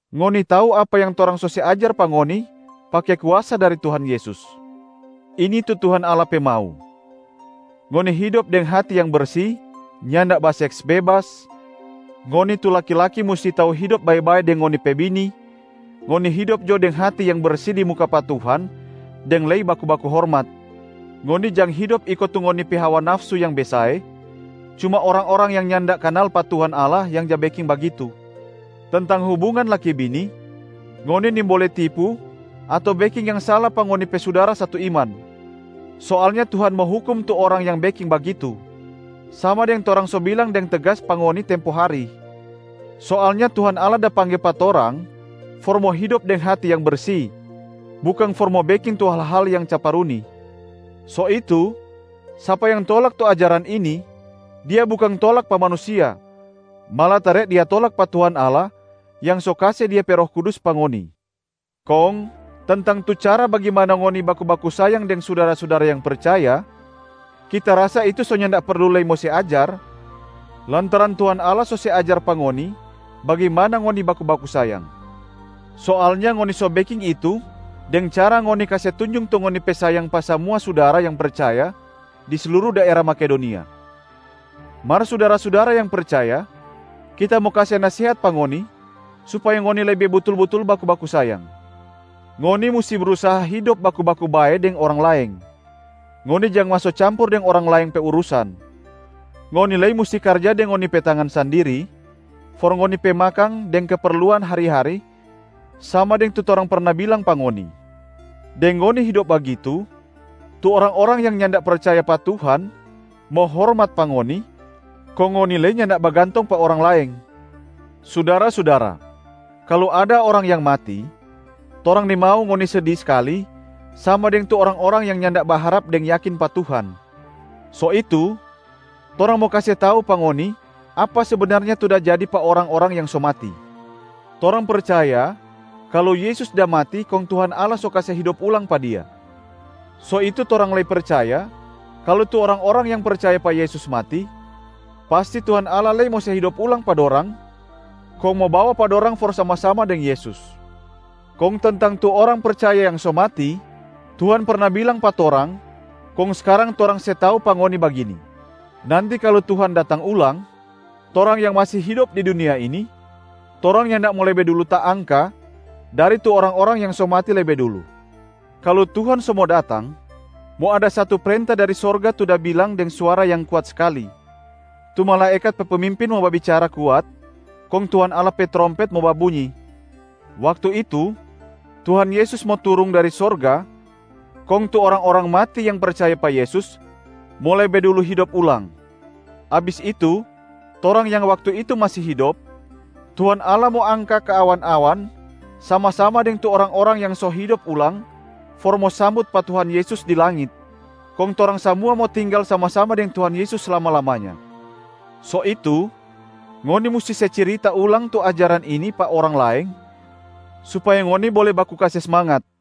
Ngoni tau apa yang torang so se ajar pa ngoni, pake kuasa dari Tuhan Yesus. Ini tu Tuhan Allah pe mau: ngoni hidop deng hati yang bersi, nyanda baseks bebas, ngoni tu laki-laki musti tau hidop bae-bae deng ngoni pe bini, ngoni hidop jo deng hati yang bersi di muka pa Tuhan deng lei baku-baku hormat. Ngoni jang hidop iko tu ngoni pe hawa nafsu yang besae, cuma orang-orang yang nyanda kanal pa Tuhan Allah yang ja beking bagitu. Tentang hubungan laki-bini, ngoni nimbole tipu ato beking yang sala pa ngoni pe sudara satu iman. Soalnya Tuhan mo hukum tu orang yang beking bagitu, sama deng torang so bilang deng tegas pa ngoni tempo hari. Soalnya Tuhan Allah da pangge pa torang for mo hidop deng hati yang bersi, bukang for mo beking tu hal-hal yang caparuni. So itu, sapa yang tolak tu ajaran ini, dia bukang tolak pa manusia, malatare dia tolak pa Tuhan Allah yang so kase Dia pe Roh Kudus pa ngoni. Kong tentang tu cara bagimana ngoni baku-baku sayang deng sudara-sudara yang percaya, kita rasa itu so nyanda perlu lei mo se ajar lantaran Tuhan Allah so se ajar pa ngoni bagimana ngoni baku-baku sayang. Soalnya ngoni so beking itu deng cara ngoni kase tunjung tu ngoni pe sayang pa samua sudara yang percaya di sluru daera Makedonia. Mar sudara-sudara yang percaya, kita mo kase nasehat pa ngoni supaya ngoni lei lebe butul-butul baku-baku sayang. Ngoni musti brusaha hidop baku-baku bae deng orang laeng. Ngoni jang maso campur deng orang laeng pe urusan. Ngoni lei musti karja deng ngoni pe tangan sandiri for ngoni pe makang deng keperluan hari-hari sama deng tu torang perna bilang pa ngoni. Deng ngoni hidop bagitu, tu orang-orang yang nyanda percaya pa Tuhan mo hormat pa ngoni, kong ngoni lei nyanda bagantong pa orang laeng. Sudara-sudara, kalu ada orang yang mati, torang nimau ngoni sedi skali sama deng tu orang-orang yang nyanda baharap deng yakin pa Tuhan. So itu torang mo kase tau pa ngoni apa sebenarnya tu da jadi pa orang-orang yang so mati. Torang percaya kalu Yesus da mati kong Tuhan Allah so kase hidop ulang pa Dia. So itu torang lei percaya kalu tu orang-orang yang percaya pa Yesus mati, pasti Tuhan Allah lei mo se hidop ulang pa dorang kong mo bawa pa dorang for sama-sama deng Yesus. Kong tentang tu orang percaya yang so mati, Tuhan perna bilang pa torang kong skarang torang se tau pa ngoni bagini: nanti kalu Tuhan datang ulang, torang yang masi hidop di dunia ini, torang nyanda mo lebe dulu taangka dari tu orang-orang yang so mati lebe dulu. Kalu Tuhan so mo datang, mo ada satu prenta dari sorga tu da bilang deng suara yang kuat skali, tu malaekat pe pemimpin mo babicara kuat, kong Tuhan Allah pe trompet mo babunyi. Waktu itu, Tuhan Yesus mo turung dari sorga kong tu orang-orang mati yang percaya pa Yesus mo lebe dulu hidop ulang. Abis itu, torang yang waktu itu masi hidop, Tuhan Allah mo angka ka awan-awan sama-sama deng tu orang-orang yang so hidop ulang for mo sambut pa Tuhan Yesus di langit, kong torang samua mo tinggal sama-sama deng Tuhan Yesus slama-lamanya. So itu, ngoni musti se cirita ulang tu ajaran ini pa orang laeng supaya ngoni bole baku kase smangat.